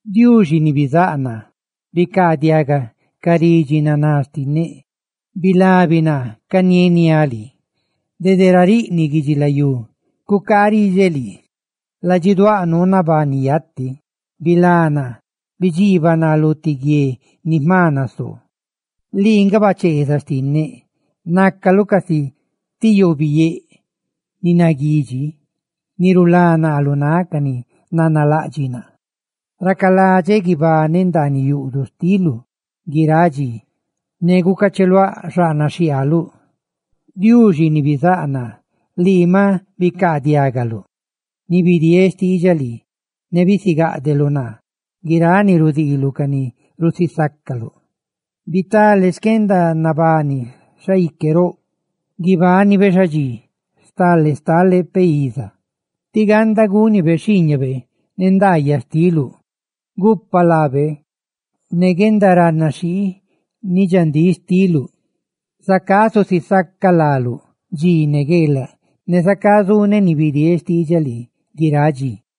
Diuxi ni bizáꞌ naa, bicaadiaga ca ridxi yuubaꞌ xtinneꞌ, ¡bilabi naa canieniáꞌ lii! Dede ra nariꞌniꞌ guidxilayú cucaaꞌ riꞌdxeꞌ lii, ladxiduáꞌ nuu nabani yati. Bilá naa, bidxiibaꞌ naa lu ti guie ni jma nasoo, lii nga bacheezaꞌ xtinneꞌ. ¡Nácaluꞌ casi ti yoobiyéꞌ ni naguidxi ni rulá naa lu náꞌ ca ni nanalaꞌdxiꞌ naa! Racaladxeꞌ guibaneꞌ ndaaniꞌ yuꞌduꞌ xtiluꞌ guiráꞌ dxi, ne gucacheluáꞌ xaꞌnaꞌ xhiaaluꞌ. Lii, Diuxi ni bizáꞌ naa, maꞌ bicaadiagaluꞌ ni bidieeꞌ xtiidxaꞌ lii, ne bisigáꞌdeluꞌ naa guiráꞌ ni rudiiluꞌ ca ni rusisaca láluꞌ. Bitalé xquendanabani xaique roꞌ; guibánibe xadxí, stale stale peꞌ iza, tí ganda gúnibe xhiiñabe ne ndaayaꞌ xtiluꞌ. Gupa laabe ne guendaranaxhii ni dxandíꞌ xtiuꞌ; zacá zusisacaꞌ láluꞌ dxi ne gueelaꞌ, ne zacá zuneꞌ ni bidieeꞌ xtiidxaꞌ lii guiráꞌ dxi.